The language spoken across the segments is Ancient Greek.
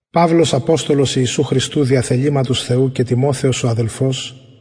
παυλος αποστολος ιησου χριστου δια θεληματος θεου και τιμοθεος ο αδελφος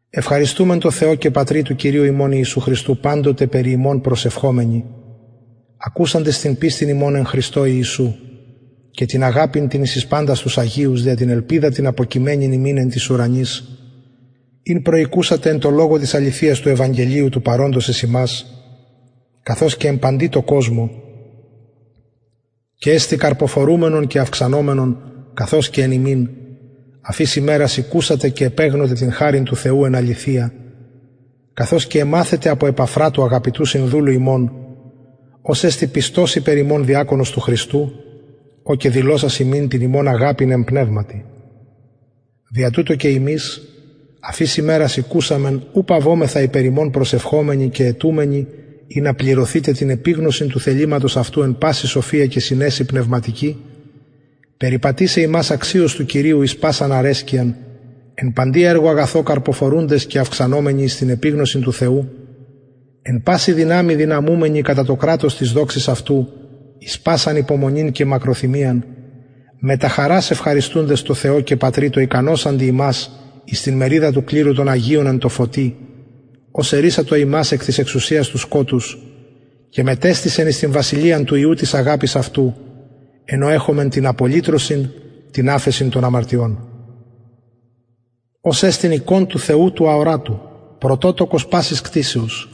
ευχαριστουμεν τω θεω και πατρι του κυριου ημων ιησου χριστου παντοτε περι υμων προσευχομενοι ακουσαντες την πιστιν υμων εν χριστω ιησου και την αγαπην την εις παντας τους αγιους δια την ελπιδα την αποκειμενην υμιν εν τοις ουρανοις ην προηκουσατε εν τω λογω της αληθειας του ευαγγελιου του παροντος εις υμας καθως και εν παντι τω κοσμω και εστιν καρποφορουμενον και αυξανομενον καθως και εν υμιν αφ ης ημερας ηκουσατε και επεγνωτε την χαριν του θεου εν αληθεια καθως και εμαθετε απο επαφρα του αγαπητου συνδουλου ημων ος εστιν πιστος υπερ υμων διακονος του χριστου ο και δηλωσας ημιν την υμων αγαπην εν πνευματι δια τουτο και ημεις αφ ης ημερας ηκουσαμεν ου παυομεθα υπερ υμων προσευχομενοι και αιτουμενοι ινα πληρωθητε την επιγνωσιν του θεληματος αυτου εν παση σοφια και συνεσει πνευματικη περιπατησαι υμας αξιως του κυριου εις πασαν αρεσκειαν εν παντι εργω αγαθω καρποφορουντες και αυξανομενοι εις την επιγνωσιν του θεου εν παση δυναμει δυναμουμενοι κατα το κρατος της δοξης αυτου εις πασαν υπομονην και μακροθυμιαν μετα χαρας ευχαριστουντες τω πατρι τω ικανωσαντι ημας εις την μεριδα του κληρου των αγιων εν τω φωτι ος ερρυσατο ημας εκ της εξουσιας του σκοτους και μετεστησεν εις την βασιλειαν του υιου της αγαπης αυτου εν ω εχομεν την απολυτρωσιν την αφεσιν των αμαρτιων ος εστιν εικων του θεου του αορατου πρωτοτοκος πασης κτισεως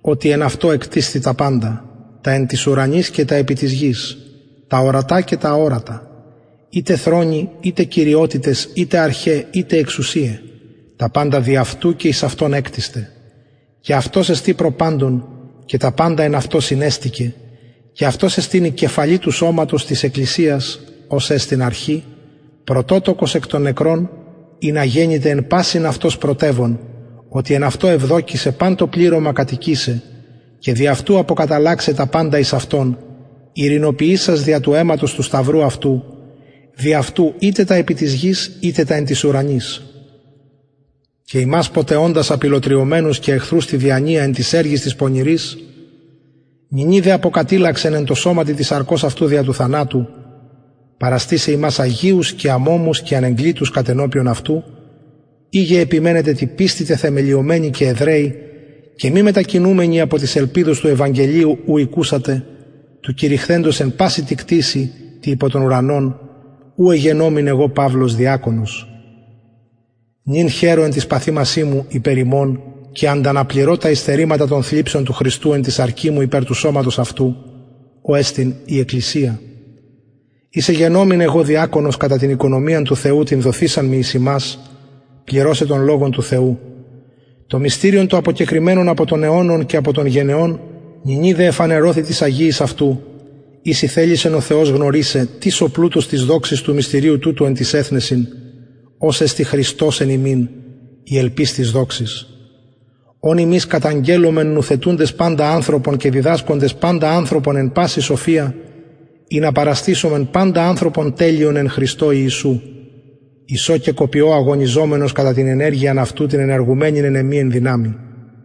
οτι εν αυτω εκτισθη τα παντα τα εν τοις ουρανοις και τα επι της γης τα ορατα και τα αορατα ειτε θρονοι ειτε κυριοτητες ειτε αρχαι ειτε εξουσιαι τα παντα δι αυτου και εις αυτον εκτισται και αυτος εστιν προ παντων και τα παντα εν αυτω συνεστηκεν και αυτος εστιν η κεφαλη του σωματος της εκκλησιας ος εστιν αρχη πρωτοτοκος εκ των νεκρων ινα γενηται εν πασιν αυτος πρωτευων οτι εν αυτω ευδοκησεν παν το πληρωμα κατοικησαι και δι αυτου αποκαταλλαξαι τα παντα εις αυτον ειρηνοποιησας δια του αιματος του σταυρου αυτου δι αυτου ειτε τα επι της γης ειτε τα επι τοις ουρανοις και υμας ποτε οντας απηλλοτριωμενους και εχθρους τη διανοια εν τοις εργοις τοις πονηροις νυνι δε αποκατηλλαξεν εν τω σωματι της σαρκος αυτου δια του θανατου παραστησαι υμας αγιους και αμωμους και ανεγκλητους κατενωπιον αυτου ειγε επιμενετε τη πιστει τεθεμελιωμενοι και εδραιοι και μη μετακινουμενοι απο της ελπιδος του ευαγγελιου ου ηκουσατε του κηρυχθεντος εν παση τη κτισει τη υπο τον ουρανον ου εγενομην εγω παυλος διακονος νυν χαιρω εν τοις παθημασιν υπερ υμων και ανταναπληρω τα υστερηματα των θλιψεων του χριστου εν τη σαρκι μου υπερ του σωματος αυτου ο εστιν η εκκλησια ης εγενομην εγω διακονος κατα την οικονομιαν του θεου την δοθεισαν μοι εις υμας πληρωσαι τον λογον του θεου το μυστηριον το αποκεκρυμμενον απο των αιωνων και απο των γενεων νυνι δε εφανερωθη τοις αγιοις αυτου οις ηθελησεν ο θεος γνωρισαι τι το πλουτος της δοξης του μυστηριου τουτου εν τοις εθνεσιν ος εστιν χριστος εν υμιν η ελπις της δοξης ον ημεις καταγγελλομεν νουθετουντες παντα ανθρωπον και διδασκοντες παντα ανθρωπον εν παση σοφια ινα παραστησωμεν παντα ανθρωπον τελειον εν χριστω ιησου εις ο και κοπιω αγωνιζομενος κατα την ενεργειαν αυτου την ενεργουμενην εν εμοι εν δυναμει